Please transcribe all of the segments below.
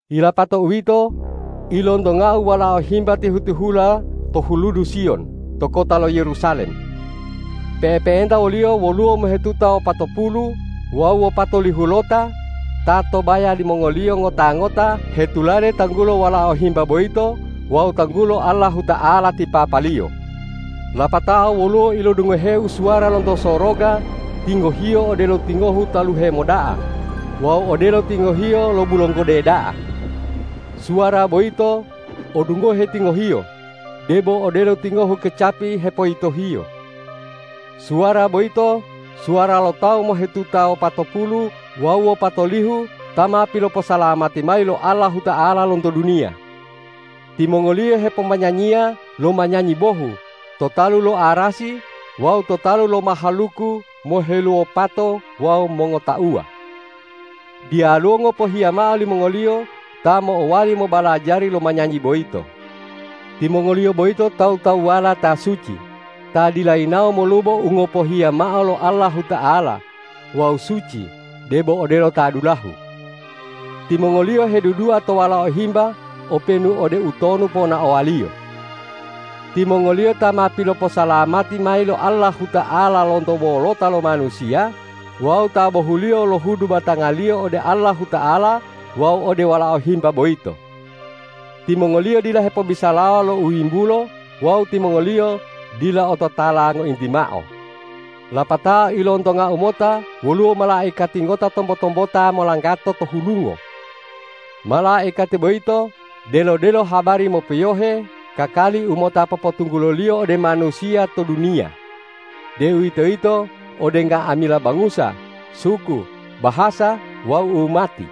Yilapato uwito, ilontongau Walao Himba tihu-tihula to huludu Siyon to kota lo Yerusalem. Pe'epe'enta wo-Liyo woluwo mohetuta wopatopulu wawu wopatolihulota ta to baya limongoliyo ngota-ngota hetulade tanggulo Walao Himba boyito wawu tanggulo Allahuta'ala ti Papa-Liyo. Lapatao woluwo ilodungoheu suwara lonto soroga tingohiyo odelo tingohu taluhe moda'a wawu odelo tingohiyo lo bulonggode da'a. Suwara boyito odungohe tingohiyo, debo odelo tingohu kecapi hepoyitohiyo. Suwara boyito suwara lo tawu mohetuta wopatopulu wawu wopatolihu ta ma piloposalamati mayi lo Allahuta'ala lonto duniya. Timongoliyo hepomanyanyiya lo manyanyi bohu to talu lo arasi wawu to talu lo mahaluku moheluwopato wawu mongotauwa. Diyaluwo ngopohiya mao limongoliyo ta mo'owali mobalajari lo manyanyi boyito. Timongoliyo boyito tawu-tawuwala ta suci, ta dila yinawo molubo u ngopohiya mao lo Allahuta'ala wawu suci debo odelo ta dulahu. Timongoliyo hedudua to Walao Himba openu ode utonu ponaowa-Liyo. Timongoliyo ta ma piloposalamati mayi lo Allahuta'ala lonto wolota lo manusiya wawu ta bohuliyo lohudu batangaliyo ode Allahuta'ala wawu ode Walao Himba boyito. Timongoliyo dila hepobisalawa lo u yimbulo wawu timongoliyo dila ototala ngointi mao. Lapatao ilontongau mota woluwo malaikati ngota tombo-tombota molanggato to hulungo. Malaikati boyito delo-delo habari mopiyohe kakali u mota popotungguloliyo ode manusiya to duniya, deuwitoyito ode nga'amila bangusa, suku, bahasa wawu umati.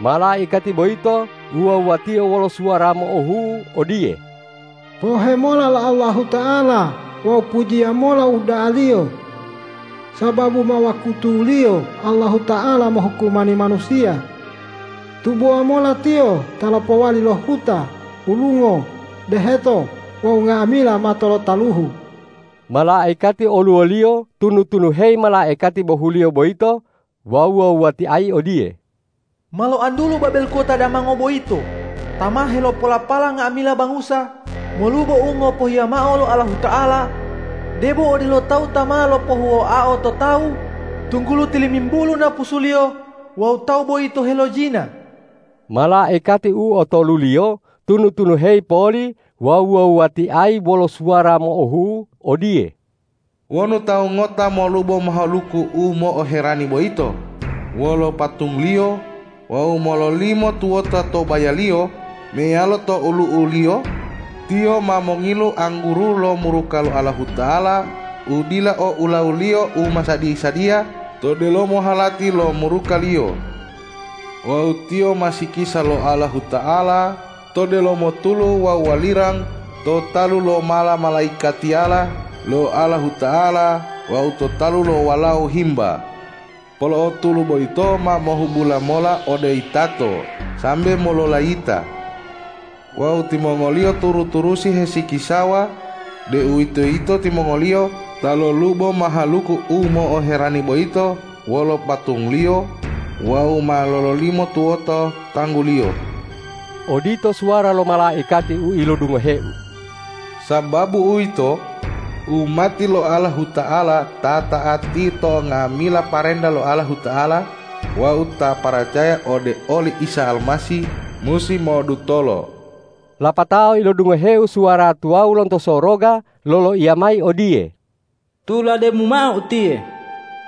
Malaikati boyito wuwa-wuwatio wolo suwara mo'ohu'u odiye,”Pohe mola lo Allahuta'ala wawu pujiya mola o uda'a-Liyo! Sababu ma wakutuliyo Allahuta'ala mohukumani manusiya. Tubowa mola Tiyo ta lopowali lo huta, hulungo, deheto wawu nga'amila mato lo taluhu!” Malaikati oluwoliyo tunu-tunuheyi malaikati bohuliyo boyito wawu wuwa-wuwatiayi odiye,”Ma loantulu Babel kota damanga boyito ta ma helopolapala nga'amila bangusa molubo u ngopohiya mao lo Allahuta'ala, debo odelo tawu ta ma lopohuwoao to tawu, tunggulo tilimimbulu napusuliyo wawu tawu boyito helojina.” Malaikati u otoluliyo tunu-tunuheyi poli wawu wuwa-wuwatiayi wolo suwara mo'ohu'u odiye,”Wonu tawu ngota molubo mahaluku u mo'oherani boyito wolo patungliyo wawu mololimo tuwota to bayaliyo meyalo to olu'uliyo, tiyo ma mongilu angguru lo muruka lo Allahuta'ala u dila o ulawuliyo u ma sadi-sadiya to delomo halati lo muruka-Liyo. Wawu tiyo ma sikisa lo Allahuta'ala to delomo tulu wawu walirang to talu lo mala-malaikatiyala lo Allahuta'ala wawu to talu lo Walao Himba. Polo'o tulu boyito ma mohubula mola ode yitato sambe mololayita. Wawu timongoliyo turu-turusi hesikisawa, deuwitoyito timongoliyo ta lolubo mahaluku u mo'oherani boyito wolo patungliyo wawu ma lololimo tuwoto tangguliyo.” Odito suwara lo malaikati u ilodungoheu. Sababu uwito, umati lo Allahuta'ala ta ta'ati to nga'amila parenta lo Allahuta'ala wawu ta paracaya ode oli Isa Almasih, musi mo'odutolo. Lapatao ilodungoheu suwara tuwawu lonto soroga loloiya mayi odiye,”Tulademu mao utiye: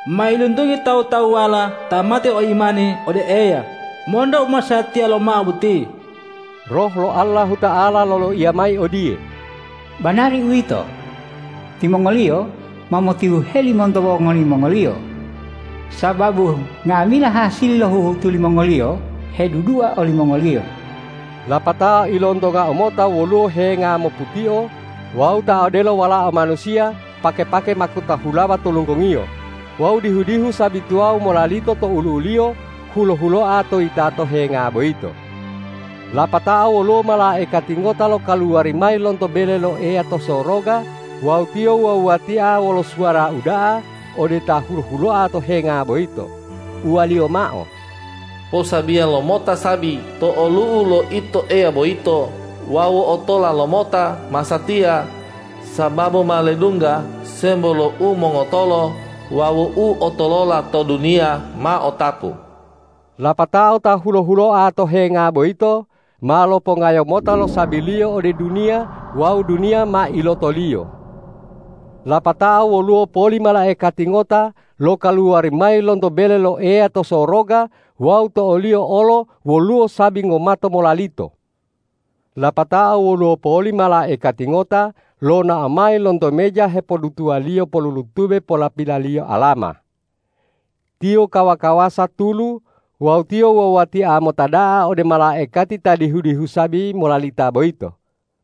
Mailuntungi tawu-tawuwala ta mate o imani ode Eya monto u masatiya lomao boti!” Roh lo Allahuta'ala loloiya mayi odiye,”Banari uwito! Timongoliyo ma motihuheli monto wongoli mongoliyo, sababu nga'amila hasili lo huhutu limongoliyo hedudua olimongoliyo.” Lapatao ilontongau mota woluwo henga moputio wawu ta odelo Walao Manusiya pake-pake makuta hulawa to lunggongiyo wawu dihu-dihu sabi tuwawu molalito to olu'u-Liyo hulo-huloa to yitato henga boyito. Lapatao woluwo malaikati ngota lokaluwari mayi lonto bele lo Eya to soroga wawu tiyo wuwa-wuwatia wolo suwara uda'a ode Ta hulo-huloa to henga boyito, uwaliyo mao,”Posabiya lomota sabi to olu'u lo Ito Eya boyito wawu otola lomota masatiya, sababu ma ledungga sembo lo umongotolo wawu uotolola to duniya ma otapu.” Lapatao Ta hulo-huloa to henga boyito ma lopongayo mota lo sabi-Liyo ode duniya wawu duniya ma iloto-Liyo. Lapatao woluwo poli malaikati ngota lokaluwari mayi lonto bele lo Eya to soroga wawu to oliyo olo woluwo sabi ngomato molalito. Lapatao woluwo poli malaikati ngota lonao mayi lonto meja hepodutuwaliyo pollutube polapilaliyo alama. Tiyo kawa-kawasa tulu wawu tiyo wuwa-wuwatia mota da'a ode malaikati ta dihu-dihu sabi molalita boyito,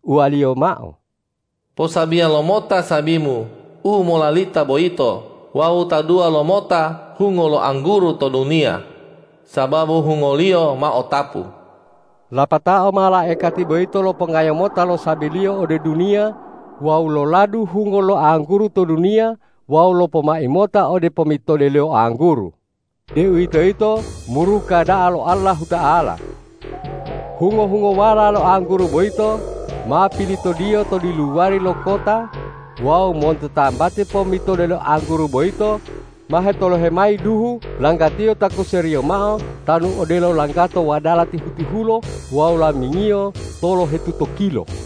uwaliyo mao,”Posabiya lomota sabimu u molalita boyito wawu taduwa lomota hungo lo angguru to duniya, sababu hungoliyo ma otapu.” Lapatao malaikati boyito lopongayo mota lo sabiliyo ode duniya wawu loladu hungo lo angguru to duniya wawu lopomai mota ode pommitode lo angguru, deuwitoyito muruka da'a lo Allahuta'ala. Hungo-hungowala lo angguru boyito ma pilitodiyo to diluwari lo kota wawu monto tambati pommitode lo angguru boyito ma hetolohe mayi duhu langgatiyo takuseriyo mao tanu odelo langgato wadala tihu-tihulo wawu lamingiyo tolohetutokilo.